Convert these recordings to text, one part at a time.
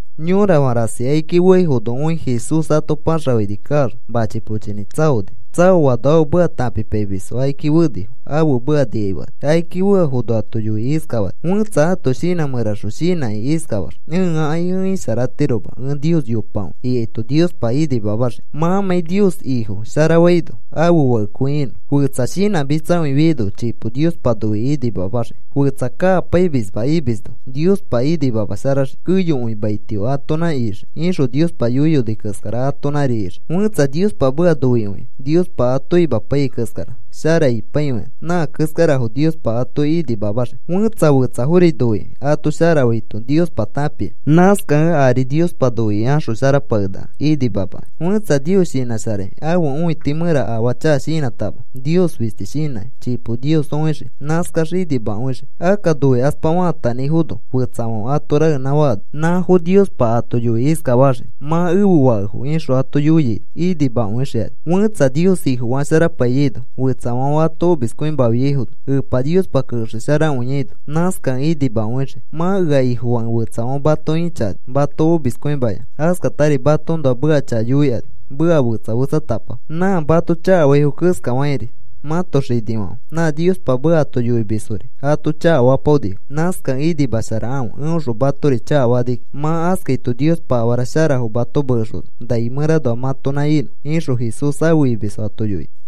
Yorafã rasi akiki feaifono õi Jesús ato paxafãini kaax, machi pochinĩ tsaoni. Tsaoano ãfe meka tãpipaimisfo akiki fenifo. Ãfe meka nikai fekani. Akiki feafono ato yoikĩ iskafani: “Fẽtsa ãto shinã mẽraxõ shinãkĩ iskafax: ‘Ẽakai ẽ isharatiroma. Ẽ Nios yopakõi,’ ikaito Niospa inimamaxii mãmãi Nios Ifo sharafaino ãfe fakekõi inõ. “Fetsa shinãmitsakõifiaino chipo Niospa noikĩ inimamaxii. “Fetsa kakapaimisma imisno Niospa inimamasharaxii. ‘Keyokõi maitio atonã ixii,’ ixõ Niospa yoiyoni keskara atonãri ixii. “Fẽtsa Niospa meka noikõikĩ Niospa ato imapaiyai keskara shara ipaikõikani, nã keskarafo Niospa ato inimamaxii. “Fẽtsa fetsafori noikĩ ato sharafaito Niospa tãpia. Nãskakẽ ari Niospa noikĩ axosharapakenaka inimamakĩ. “Fẽtsa Nios shinãsharakĩ, ãfe õiti mẽra afaa chaka shinãtama Nios fisti shinãkĩ chipo Nios õixii. Nãskax inimakõixii. “Akka noikaspa faatanãifono fẽtsafãfe ato raenã faano, nãfo Niospa ato yoikĩ iskafaxii: ‘Mã ẽfe fakefo,’ ixõ ato yoiaino inimakõixikani. “Fẽtsa Nios Ifofasharapaiyaino, fetsafãfe ato omiskõimafiaifono, Epa Niospa kexesharakõiano nãskakẽ inimakõixii. “Mã ea Ifofakẽ fetsafãfe mato ĩchakani, mato omiskõimayanã askatari matoõnoa meka chaka yoikani meka fetsa fetsatapafo. Nã mato chakafaifo keskafakĩri mãto xinifãfe nã Niospa meka ato yoixomisfori ato chakafapaonifo. Nãskakẽ inimasharakãfe eõxõ matori chakafakani kiki. Mã askaito Niospa afara sharafo mato mekexona nai mẽranoa mãtonã inõ,” ixõ Jesús afe imisfo ato yoini.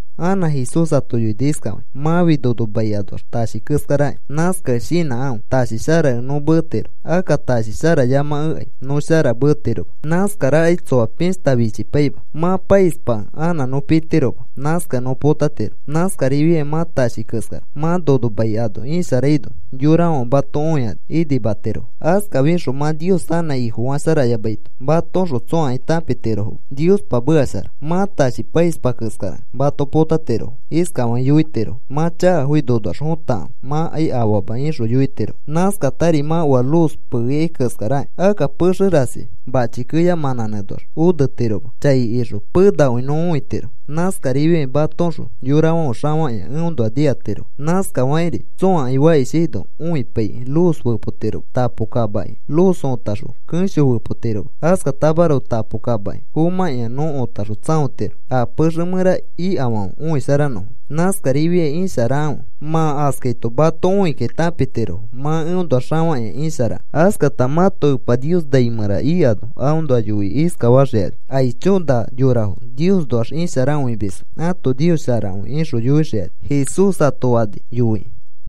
Anã Jesús ato yoini iskafakĩ: “Mãfi nono mai anoax tashi keskaraki. Nãskakẽ shinãkãfe. Tashi sharakẽ nõ meetiro. Akka tashi sharayamakekai nõ shara meetiroma. Nãskarakai tsoa pishta fichipaima. Mã paispakẽ anã nõ pitiroma. Nãskakẽ nõ potatiro. Nãskarifiai mã tashi keskara. Mã nono mai ano isharaino yorafãfe mato õikani inimatirofo. Askafixõ mã Nios anã Ifofasharayamaito matoõxõ tsõakai tãpitirofoma Niospa meka shara. Mã tashi paispa keskarakẽ mato potatirofo. Iskafakĩ yoitirofo: ‘Mã chakafoki nonoax fotakãfe. Mãkai afaama,’ ixõ yoitirofo. “Nãskatari mã oa luz peeikai keskarakĩ. Akka pexe rasi mãchi keya mãnãnẽnoax onetiroma. Chai ixõ penakõi nõ õitiro. Nãskarifiai matoõxõ yorafãfe xafakĩa eõnoa nikatirofo. Nãskafakĩri tsõakai fakishaino õipaifikĩ luz fepotiroma. Tapo kamaki luz õtaxõ kẽsho fepotiroma. Askatamaroko tapo kamaki fomãkĩa nõ õtaxõ tsãotiro a pexe mẽra ikafãfe õisharanõfo. Nãskarifiai isharakãfe. Mã askaito mato õikakĩ tãpitirofo mã eõnoax xafakĩa isharakẽ. Askata mãto Epa Nios nai mẽra ikano aõnoa yoikĩ iskafaxikani: ‘¡Aicho! Na yorafo Niosnoax isharakõimisfo. Ãto Nios sharakõi,’ ixõ yoixikani,” Jesús ato fani yoikĩ.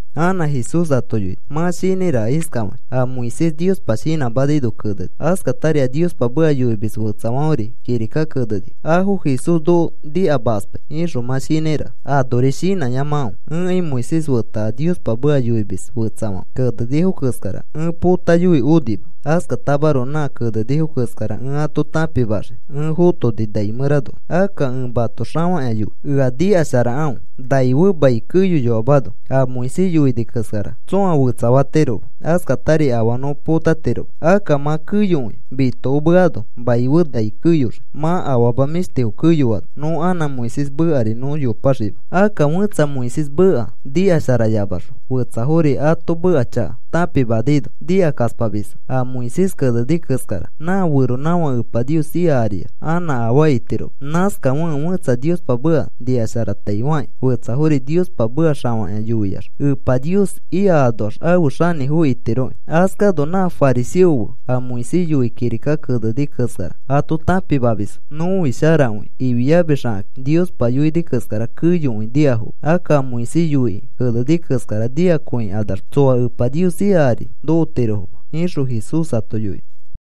Anã Jesús ato yoini: “Mã shinãiraka iskafakĩ: ‘A Moisés Niospa shinãmanaino keneni, askatari a Niospa meka yoimis fetsafãferi kirika kenenifo afo Jesús noko nikamakaspai,’ ixõ mã shinãiraka. Anori shinãyamakãfe. Ẽkai Moisés feta a Niospa meka yoimis fetsafãfe kenenifo keskara ẽ potayoi onima. Askatamaroko nã kenenifo keskara ẽ ato tãpimaxii ẽ fotoni nai mẽranoax. Akka ẽ mato xafakĩa yoi. Ea nikasharakãfe. Nai fe mai keyoyoamano a Moisés yoini keskara tsõa fetsafatiroma. Askatari afaa nõ potatiroma. Akka mã keyokõi mitokomeano, mai fe nai keyoxii. Mã afama mĩshtifo keyoano nõ anã Moisés mekari nõ yopaxima. Akka fẽtsa Moisés meka nikasharayamaxõ fetsafori ato meka chaka tãpimanaino nikakaspamisfo a Moisés keneni keskara. Nã feronãfake Epa Nios ika ariax anã afaa itiroma. Nãskafekẽ fẽtsa Niospa meka nikasharataifakĩ fetsafori Niospa meka xafakĩa yoiax Epa Nios ika anoax afe xanĩfo itiroki. Askano nã fariseofo fe a Moisés yoikĩ kirika keneni keskara ato tãpimamisfo, ‘Nõfi sharakõi,’ ifiamisxakakĩ Niospa yoini keskara keyokõi nikafoma. Akka a Moisés yoikĩ keneni keskara nikakõikanaxma tsoa Epa Nios ika ari nokotirofoma,” ixõ Jesús ato yoini.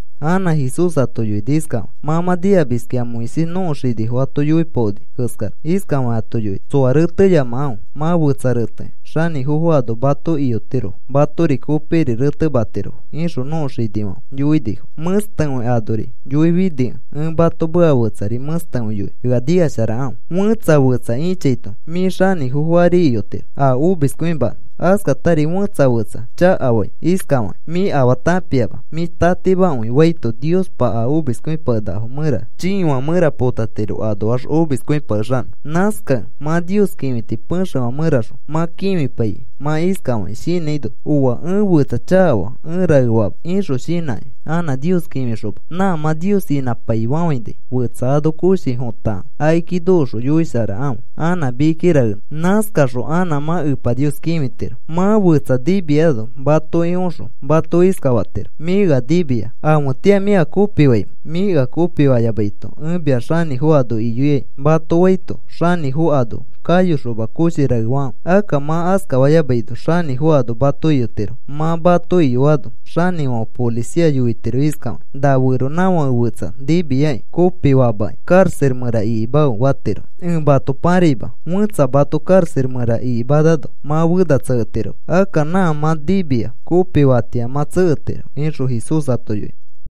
Anã Jesús ato yoini iskafakĩ: “Mã mã nikamiskĩ a Moisés nõko xinifo ato yoipaoni keskara. Iskafakĩ ato yoini: ‘Tsoa reteyamakãfe. Mã fetsa retekẽ xanĩfofo ano mato iyotirofo matori kopikiri retematirofo,’ ixõ nõko xinifãfe yoinifo. Mẽstekõi anori yoifinikẽ ẽ mato meka fetsari mẽstekõi yoinõ. Ea nikasharakãfe. Fẽtsa fetsa ĩchaito mĩ xanĩfofo ari iyotiro a omiskõimanõ. Askatari fẽtsa fetsa chakafai iskafakĩ: ‘Mĩ afaa tãpiama. Mĩ tatimakõi,’ faito Niospa a omiskõipakenakafo mẽra chiifã mẽra potatiro anoax omiskõipakexanõ. “Nãskakẽ mã Nios kĩfiti pexefã mẽraxõ mã kĩfipaikĩ mã iskafaki shinãino: ‘Ooa, ẽ fetsa chakafaa ẽ raefama,’ ixõ shinãkĩ, anã Nios kĩfixoma nã mã Nios inãpaifafãinai fetsa ano koshi fotakãfe. Akiki nokoxõ yoisharafe anã mikiki raenõ. Nãskaxõ anã mã Epa Nios kĩfitiro. “Mã fetsa nimiano matoki oxõ mato iskafatiro: ‘Mĩ ea nimia. ¿Afetĩa mĩ ea kopifaimẽ? Mĩ ea kopifayamaito ẽ mia xanĩfo ano iyoikai,’ mato faito, xanĩfo ano kayoxoma koshi raefakãfe. Akka mã askafayamaino xanĩfo ano mato iyotiro. Mã mato iyoano xanĩfãfe policia yoitiro iskafakĩ: ‘Na feronãfãke fetsa nimiakĩ kopifaamaki, karaxa mẽra ikimafe,’ fatiro. Ẽ mato paraima. Fẽtsa mato karaxa mẽra ikimanano mã fena tseketiroma. Akka nã mã nimia kopifatĩa mã tseketiro,” ixõ Jesús ato yoini.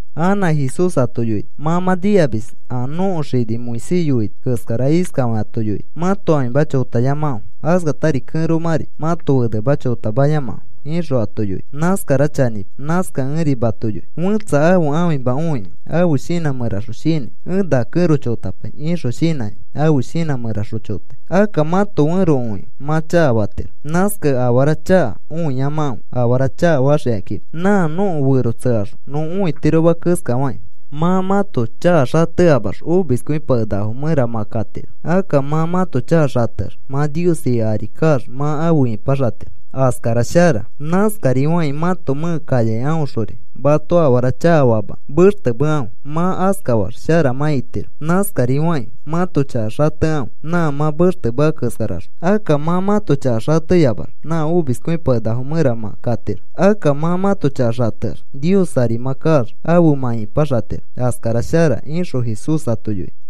Anã Jesús ato yoini: “Mã mã nikamis a nõko xini Moisés yoini keskara. Iskafakĩ ato yoini: ‘Mãto ãfima chotayamakãfe. Askatari kẽromãri mãto fenema chotamayamakãfe,’ ixõ ato yoini. Nãskara chanĩma. Nãskakẽ ẽri mato yoi, fẽtsa ãfe ãfima õikĩ ãfe shinã mẽraxõ shinãi: ‘Ẽ na kẽro chotapai,’ ixõ shinãkĩ ãfe shinã mẽraxõ chotai. “Akka mãto fẽro õikĩ mã chakafatiro. Nãskakẽ afara chaka õiyamakãfe afara chakafaxikakima, nã nõko fero tsekaxõ nõ õitiroma keskafakĩ. Mã mãto chaka xateyamax omiskõipakenakafo mẽra mã katiro. Akka mã mãto chaka xateax mã Nios ika ari kaax mã afe ipaxatiro. Askara shara. Nãskarifakĩ mãto mẽke kayakai aõxori mato afara chakafamakẽ, mextemekãfe. Mã askafax shara mã itiroki. Nãskarifakĩ mãto chaka xatekãfe nã mã mextemea keskaraxõ. Akka mã mãto chaka xateyamax, nã omiskõipakenakafo mẽra mã katiro. Akka mã mãto chaka xateax, Nios ari mã kaax afe mã ipaxatiro. Askara shara,” ixõ Jesús ato yoini.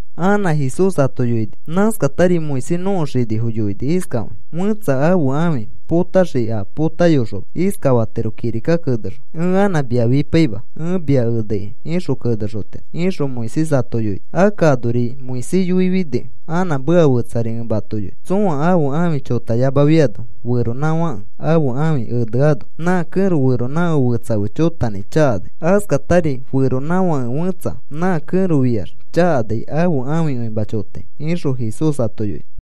Anã Jesús ato yoini: “Nãskatari Moisés nõko xinifo yoini iskafakĩ: ‘Fẽtsa ãfe ãfi potaxikĩ a potayoxoma iskafatiro kirika kenexõ: “Ẽ anã mia fipaima. Ẽ mia eneikai,” ixõ kenexotiro,’ ixõ Moisés ato yoini. Akka anori Moisés yoifinikẽ anã meka fetsari ẽ mato yoinõ. Tsõa ãfe ãfi chotayamafiano, feronãfake ãfe ãfi eneano nã kẽro feronãfãke fetsa fe chotanãi chakanai. Askatari feronãfake fẽtsa nã kẽro fĩax chakanai ãfe ãfikõima chotai,” ixõ Jesús ato yoini.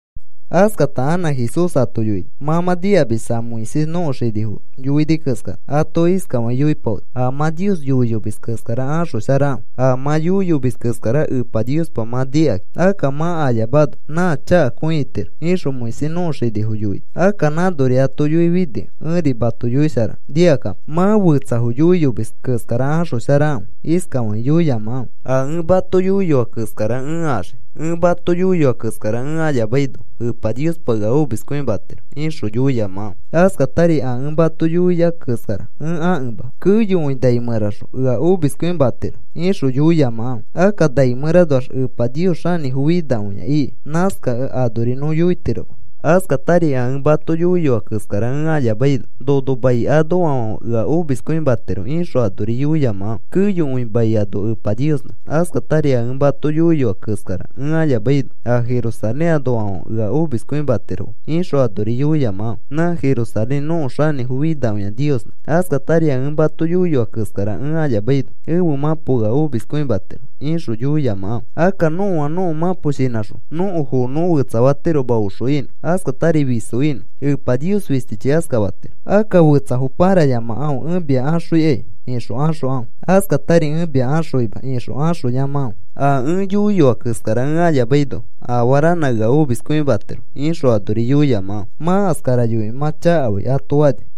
Askata anã Jesús ato yoini: “Mã mã nikamis a Moisés nõko xinifo yoini keskara. Ato iskafakĩ yoipaoni: ‘A mã Nios yoiyomis keskara axosharakãfe. A mã yoiyomis keskara Epa Niospa mã nikakĩ akka mã ayamano nã chakakõi itiro,’ ixõ Moisés nõko xinifo yoini. Akka nãnori ato yoifinikẽ, ẽri mato yoisharanõ. Nikakapo. Mã fetsafo yoiyomis keskara axosharakãfe. Iskafakĩ yoiyamakãfe: ‘A ẽ mato yoiyoa keskara ẽ axii. Ẽ mato yoiyoa keskara ẽ ayamaino Epa Niospa ea omiskõimatiro,’ ixõ yoiyamakãfe. Askatari, ‘A ẽ mato yoia keskara ẽ akẽma keyokõi nai mẽraxõ ea omiskõimatiro,’ ixõ yoiyamakãfe. Akka nai mẽranoax Epa Nios xanĩfo finakõia iki. Nãskakẽ anori nõ yoitiroma. Askatari, ‘A ẽ mato yoiyoa keskara ẽ ayamaino nono mai anoafãfe ea omiskõimatiro,’ ixõ anori yoiyamakãfe. Keyokõi mai ano Epa Niosnã. Askatari, ‘A ẽ mato yoiyoa keskara ẽ ayamaino a Jerusalén anoafãfe ea omiskõimatirofo,’ ixõ anori yoiyamakãfe. Nã Jerusalén nõko xanĩfo finakõi Niosnã. Askatari, ‘A ẽ mato yoiyoa keskara ẽ ayamaino ẽfe mãpo ea omiskõimatiro,’ ixõ yoiyamakãfe. Akka nõa nõko mãpo shinãxõ nõko foo nõ fetsafatiroma oxo inõ, askatari fiso inõ. Epa Nios fistichi askafatiro. Akka fetsafo parayamakãfe. ‘Ẽ mia axõikai,’ ixõ axokãfe. Askatari, ‘Ẽ mia axõima,’ ixõ axoyamakãfe. ‘A ẽ yoiyoa keskara ẽ ayamaino afaa ranã ea omiskõimatiro,’ ixõ anori yoiyamakãfe. Mã askara yoikĩ mã chakafai,” ato fani.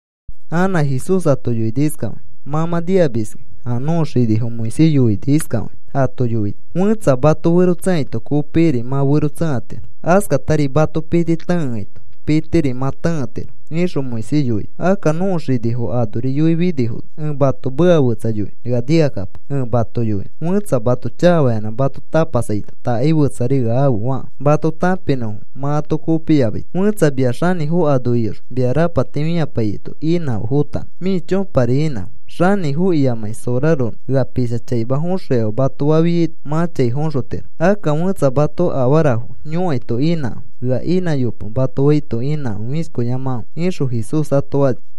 Anã Jesús ato yoini iskafakĩ: “Mã mã nikamiski a nõko xinifo Moisés yoini. Iskafakĩ ato yoini: ‘Fẽtsa mato fero tsẽkaito, kopikiri mã fero tsẽkatiro. Askatari mato piti tẽkeaito, pitiri mã tẽketiro,’ ixõ Moisés yoini. Akka nõko xinifo anori yoifinifono, ẽ mato meka fetsa yoinõ. Ea nikakapo ẽ mato yoinõ. Fẽtsa mato chakafayanã mato tapasaito, ‘Takai fetsari ea afe,’ fakãfe mato tãpinõfo mã ato kopiyamaito. Fẽtsa mia xanĩfo ano iyoxõ mia rapati fĩapaiyaito, inãfe fotanõ. Mĩ chõpari inãfe. Xanĩfo iyamakĩ soraronõ, ‘Ea pisha chaima foxõikafe,’ mato fafiaito, mã chai foxotiro. Akka fẽtsa mato afarafo yõkaito inãkãfe. ‘Ea inãyope,’ mato faito inãfe fĩshkoyamakãfe,” ixõ Jesús ato fani.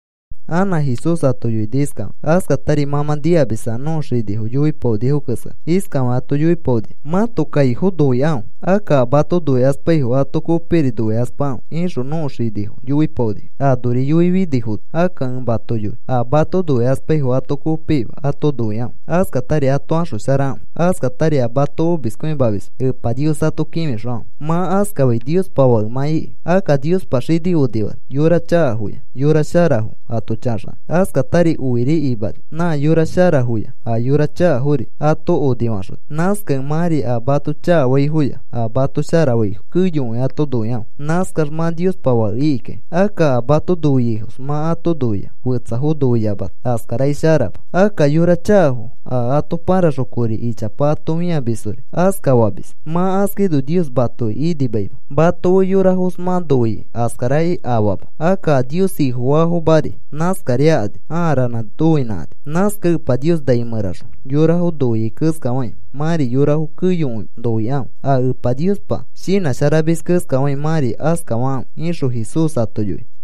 Anã Jesús ato yoini iskafakĩ: “Askatari mã mã nikamis a nõko xinifo yoipaonifo keskara. Iskafakĩ ato yoipaonifo: ‘Mãto kaifo noikãfe. Akka a mato noikaspaifo ato kopikiri noikaspakãfe,’ ixõ nõko xinifo yoipaonifo. Anori yoifinifono, akka ẽ mato yoi a mato noikaspaifo ato kopikima ato noikãfe. Askatari ato axosharakãfe. Askatari a mato omiskõimamisfo Epa Nios ato kĩfixokãfe. Mã askafai Niospa fake mã iki. Akka Niospa xini onifani yora chakafoya, yora sharafo ato chaxanõ. Askatari oiri imani nã yora sharafoya a yora chakafori ato onifaxoni. Nãskakẽ mãri a mato chakafaifoya a mato sharafaifo keyokõi ato noikãfe. Nãskax mã Niospa fake ikikai. Akka a mato noiaifos mã ato noia fetsafo noiyamata askarakai sharama. Akka yora chakafo a ato paraxõ kori ichapa ato fĩamisfori aska famis. Mã askaino Nios matoki inimaima. Mato fe yorafos mã noia askarakai afaama. Akka a Nios Ifofaafomari nãskarifiakani aa ranãri noinãkani. Nãskakẽ Epa Nios nai mẽraxõ yorafo noiai keskafakĩ mãri yorafo keyokõi noikãfe. A Epa Niospa shinãsharamis keskafakĩ mãri askafakãfe,” ixõ Jesús ato yoini.